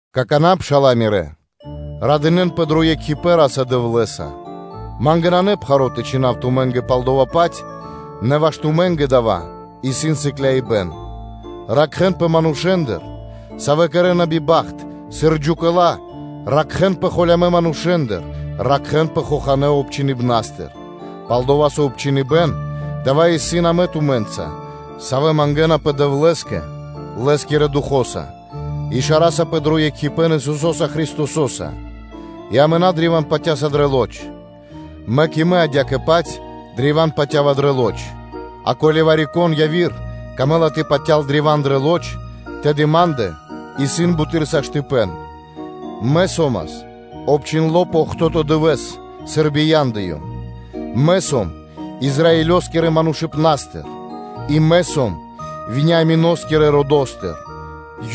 Какана́, пшала́лэ мирэ́, радынэ́нпэ дро екхипэ́н Ра́са-Дэвлэ́са: ма́нгэ нанэ пхаро́ тэ чхинав тумэ́нгэ пал дава́-паць, нэ ваш тумэ́нгэ дава́ исын сыкляибэн. Ракхэ́нпэ манушэ́ндыр, савэ́ кэрэ́на биба́хт, сыр джукэла, ракхэ́нпэ холямэ́ манушэ́ндыр, ракхэ́нпэ хоханэ́ обчхиныбнастыр. Пал-дова́ со обчхиныбэн дава́ исын амэ тумэ́нца, савэ́ мангэ́напэ Дэвлэ́скэ Лэ́скирэ Духо́са, и шарасапэ дро екхипэ́н Исусо́са Христосо́са, и амэ на древа́н патя́са дрэ лоч (плоть), мэк и мэ адя́кэ-паць древа́н патя́ва дрэ лоч; а ко́ли вари-кон яви́р камэ́ла тэ патял древа́н дрэ лоч, тэды ма́ндэ исын буты́р саштыпэн: мэ со́мас обчхиндло пэ охто́то (бидуе́нгиро дэ́што) дывэ́с, сыр бияндыём, мэ сом Израилёскирэ родо́стыр, и мэ сом Вениамино́скирэ родыцо́стыр,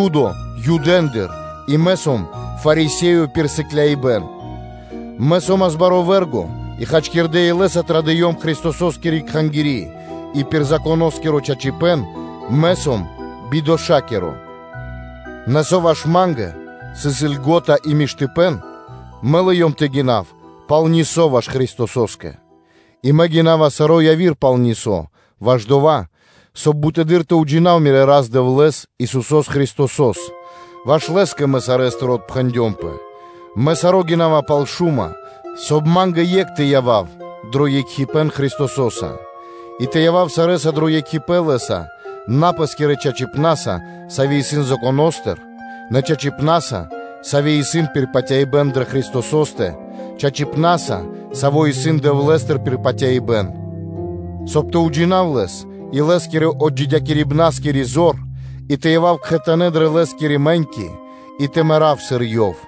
Юдо Юдэндыр, и мэ сом Фарисеё пир сыклякирибэ́н; мэ со́мас баро́ вэ́рго и хачкирдэ́ илэ́са традыём Христососкири Кхангири́ и пир Законоскиро чачипэ́н мэ сом бидошакиро; нэ со ваш ма́нгэ сыс льго́та, мэ лыём тэ гинав пал хасибэ́н ваш Христосо́скэ. И мэ гинава саро́ яви́р пал хасибэ́н ваш дова́, соб (кай) бутэды́р тэ уджинав мирэ́ Рас-Дэвлэ́с, Исусо́с Христосо́с, ваш Лэ́скэ мэ сарэ́стыр отпхэндёмпэ, мэ саро́ гинава пал шума (смети), соб (кай) ма́нгэ екх тэ явав дро екхипэ́н Христосо́са; и тэ явав сарэ́са дро екхипэ́н Лэ́са на пэ́скирэ чачипна́са; саво́ исын Законо́стыр, нэ чачипна́са, саво́ исын пир патяибэ́н дро Христосо́стэ, чачипна́са, саво́ исын Дэвлэ́стыр пир патяибэ́н, соб (кай) тэ уджинав Лэс и Лэ́скирэ отджидякирибнаскири зор, и тэ явав кхэтанэ́ дрэ Лэ́скирэ мэ́ньки, и тэ мэрав, сыр Ёв.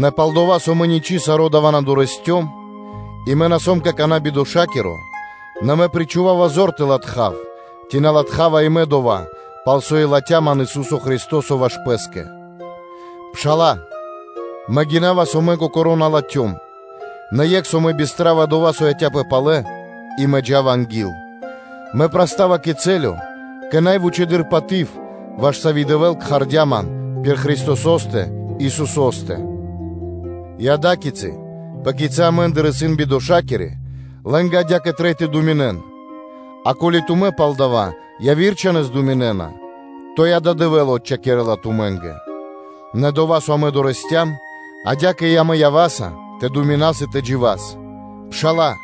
Нэ пал-дова́, со мэ ничы́ саро́ дава́ на дорэсцём, и мэ на сом какана́ бидошакиро, нэ мэ причхувава зор тэ латхав, ци на латхава и мэ дова́, пал со и латхя́ ман Ису́со Христо́со ваш Пэ́скэ. Пшала́лэ, мэ гинава, со кокоро́ мэ на латхём, нэ екх, со мэ бистрава дова́, со яця́пэ палэ, и мэ джа́ва анги́л, мэ прастава кэ цэлё, кэ най вучэды́р паты́в, ваш сави́ Дэвэ́л кхардя́ ман пир Христосо́стэ Исусо́стэ. И ада́кицы, пэ кицы́ амэ́ндыр исын бидошакирэ мануша́, лэ́нгэ адя́кэ трэй тэ думинэн, а ко́ли тумэ́ пал дава́ пэ яви́р думинэ́на, то и дава́ Дэвэ́л отчхакирэла тумэ́нгэ. Нэ дова́, со амэ прилыям, адя́кэ и амэ ява́са тэ думинас и тэ джива́с. Пшала́лэ,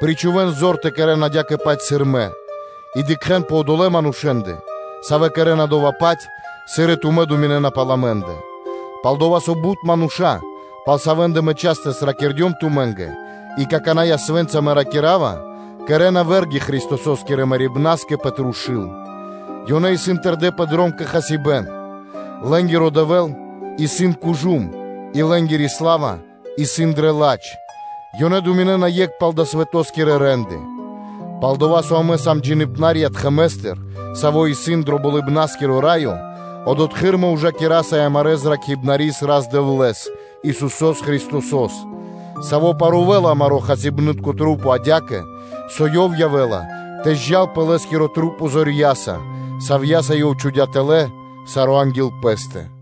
причхувэ́н зор тэ кэрэ́н адя́кэ-паць сыр мэ, и дыкхэ́н пэ одолэ́ манушэ́ндэ, савэ́ кэрэ́на дова́-паць, сыр и тумэ́ думинэ́на пал амэ́ндэ; пал-дова́ со бут мануша́, пал савэ́ндэ мэ частэс ракирдём тумэ́нгэ, а какана́ и ясвэ́нца мэ ракира́ва, кэрэ́на сыр вэ́рги Христосо́скирэ мэрибна́скэ пэ трушу́л: ёнэ исын тэрдэ́ пэ дром кэ хасибэ́н, лэ́нгиро дэвэл исын кужум (жэлудко), и лэ́нгири сла́ва исын дрэ ладж, ёнэ думинэ́на екх пал далэ́ свэто́скирэ рэ́нды: пал-дова́ со амэ сам джиибнарья тхэмэстыр (штэто́стыр), саво́ исын дро Болыбна́скиро Раё, одотхы́р амэ ужакираса и амарэ́ Зракхибнарис Рас-Дэвлэ́с, Исусо́с Христосо́с, Саво́ парувэла амарэ́ хасибны́тка маса́ адя́кэ, со ёв явэ́ла тэ зджал пэ Лэ́скирэ маса́ зорья́са, савья́са Ёв чхудя́ тэлэ́ саро́ анги́л Пэ́стэ.